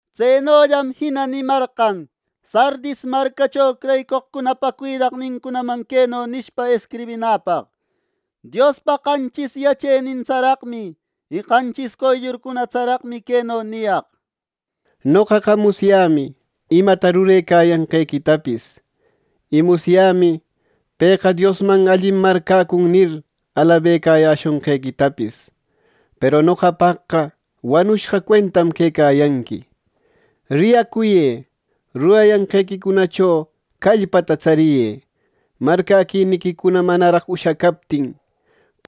Tsenollam jina nimarqan Sardis marcacho creyicoqcunapa cuidaqninman queno nishpa escribinäpaq: “Diospa qanchis yacheninta tsararaqmi y qanchis qoyllurcuna tsararaqmi queno niyaq: Noqaqa musyämi imata rurecayanqequitapis, y musyämi ‘Pëqa Diosman allim marcäcun’ nir, alabecayäshonqequitapis, peru noqapaqqa wanushqa cuentam quecayanqui. ¡Riyacuyë! ¡Rurayanqequicunacho callpata tsariyë! Marcäquiniquicuna manaraq ushacaptin;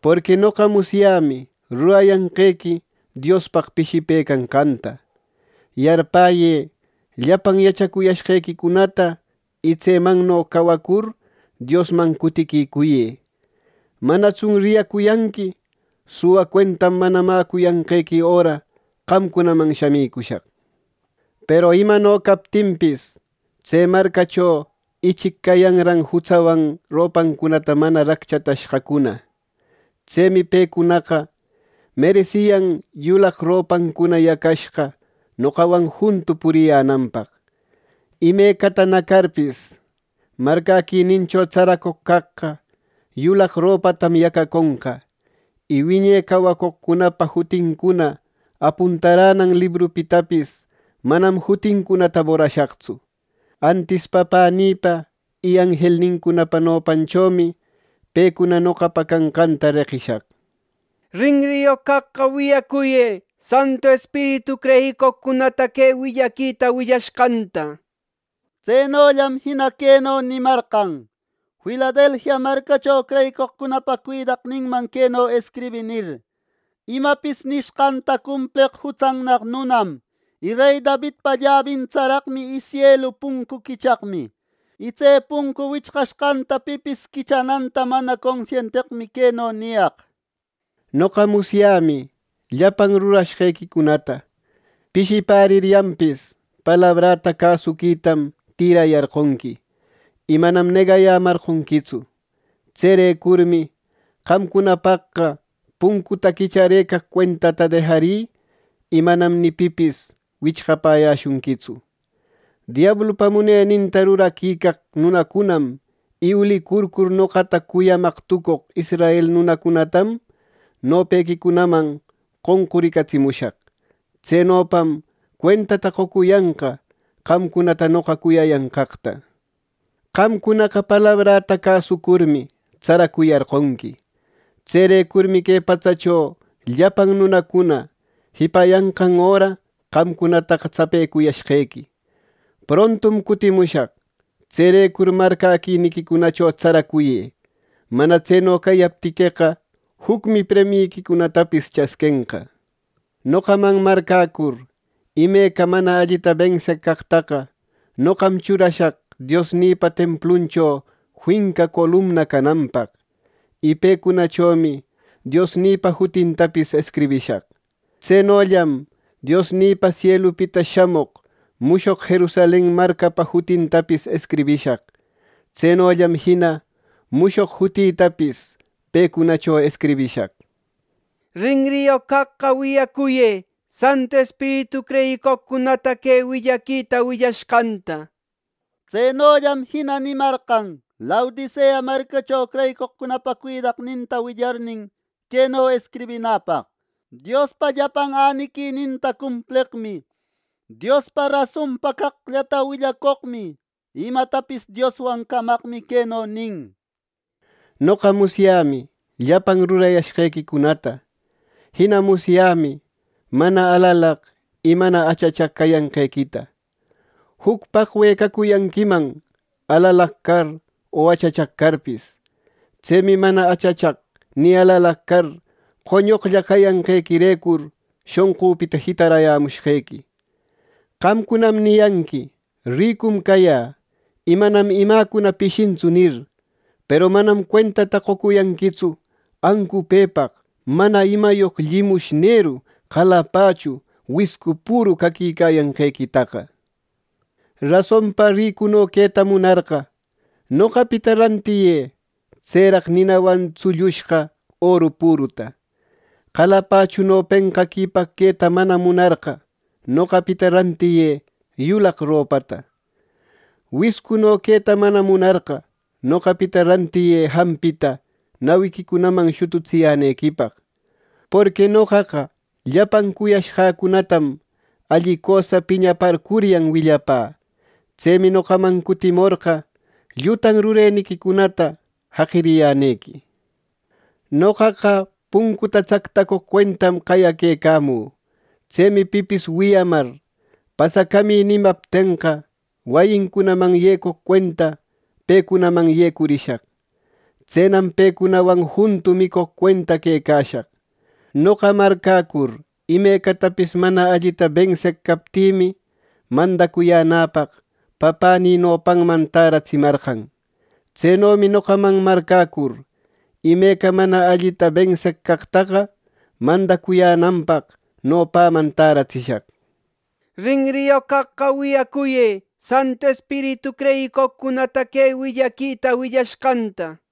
porqui noqa musyämi rurayanqequi Diospaq pishipëcanqanta. Yarpäyë llapan yachacuyashqequicunata y tsemanno cawacur, Diosman cutiquicuyë. Manatsun riyacuyanqui, suwa cuentam mana mäcuyanqequi öra qamcunaman shamicushaq. Peru imano captinpis, tse marcacho ichic cayanran jutsawan ropancunata mana racchatashqacuna. Tsemi pecunaqa meresiyan yulaq ropancuna yacashqa noqawan juntu puriyänanpaq. Imecata nacarpis, marcäquinincho tsaracoq caqqa yulaq ropatam yacaconqa; y wiñe cawacoqcunapa jutincuna apuntaränam librupitapis manam jutincunata borashaqtsu. Antis Papänïpa y anjelnincunapa nopanchomi pecuna noqapa canqanta reqishaq. Rinriyoq caqqa wiyacuyë, Santu Espiritu creyicoqcunata que willaquita willashqanta” nir. Tsenollam jina queno nimarqan: “Filadelfia marcacho creyicoqcunapa cuidaqninman queno escribï nir: ‘Imapis nishqanta cumpleq jutsannaq nunam, y rey Davidpa llabin tsaraqmi y sielu puncu quichaqmi, y tse puncu wichqashqanta pipis quichananta mana consienteqmi queno niyaq: Noqa musyämi llapan rurashqequicunata. Pishipäriryanpis, palabräta cäsuquitam tïrayarqonqui y manam negayämarqonquitsu. Tserecurmi qamcunapaqqa puncuta quicharëcaq cuentata dejarï, y manam ni pipis wichqapäyäshunquitsu. Diablupa muneninta ruraquicaq nunacunam y ulicurcur noqata cuyamaq tucoq israel nunacunatam, nopequicunaman qonquricatsimushaq. Tsenopam cuentata qocuyanqa qamcunata noqa cuyayanqaqta. Qamcunaqa palabrata cäsucurmi, tsaracuyarqonqui. Tserecurmi que patsacho llapan nunacuna jipayanqan öra qamcunataqa tsapecuyashqequi. Prontum cutimushaq. Tserecur marcäquiniquicunacho tsaracuyë. Mana tseno cayaptiqueqa, jucmi premiyiquicunatapis chasquenqa. Noqaman marcäcur imeca mana allita benseq caqtaqa, noqam churashaq Diosnïpa templuncho finca columna cananpaq, y pecunachomi Diosnïpa jutintapis escribishaq. Tsenollam Diosnïpa sielupita shamoq mushoq Jerusalen marcanpa jutintapis escribishaq. Tsenollam jina mushoq jutïtapis pecunacho escribishaq. Rinriyoq caqqa wiyacuyë Santu Espiritu creyicoqcunata que willaquita willashqanta’” nir. Tsenollam jina nimarqan Laodicea marcacho creyicoqcunapa cuidaqninta willarnin, queno escribinäpaq: “Diospa llapan äniquininta cumpleqmi, Diospaq rasonpa caqllata willacoqmi, y imatapis Dioswan camaqmi queno nin: Noqa musyämi llapan rurayashqequicunata. Jina musyämi mana alalaq y mana achachaq cayanqequita. Juc paqwe cacuyanquiman, alalaq car, o achachaq carpis. Tsemi mana achachaq ni alalaq car, qoñoqlla cayanqequirecur shonqüpita jitarayämushqequi. Qamcunam niyanqui ‘¡Ricum cayä, y manam imäcuna pishintsu!’ nir; peru manam cuentata qocuyanquitsu ancupëpaq, mana imayoq llimushneru, qalapachu, wiscu püru caquicayanqequitaqa. Rasonpa ricuno queta munarqa, noqapita rantiyë tseraq ninawan tsullushqa oru püruta. Qalapachuno penqaquipaq queta mana munarqa, noqapita rantiyë yulaq ropata. Wiscuno queta mana munarqa, noqapita rantiyë jampita nawiquicunaman shututsiyänequipaq. Porqui noqaqa llapan cuyashqäcunatam alli cösa piñaparcuryan willapä. Tsemi noqaman cutimorqa, llutan rureniquicunata jaqiriyänequi. Noqaqa puncuta tsaqtacoq cuentam qayaquecamü. Tsemi pipis wiyamar ‘Pasacamï’ nimaptenqa wayincunaman yecoq cuenta pecunaman yecurishaq. Tsenam pecunawan juntu micoq cuenta quecashaq. Noqa marcäcur imeca mana allita benseq captïmi, mandacuyänäpaq Papänï nopanman tärätsimarqan. Tsenomi noqaman marcäcur imeca mana allita benseq caqtaqa, mandacuyänanpaq nopäman täratsishaq. Rinriyoq caqqa wiyacuyë Santu Espiritu creyicoqcunata que willaquita willashqanta” nir.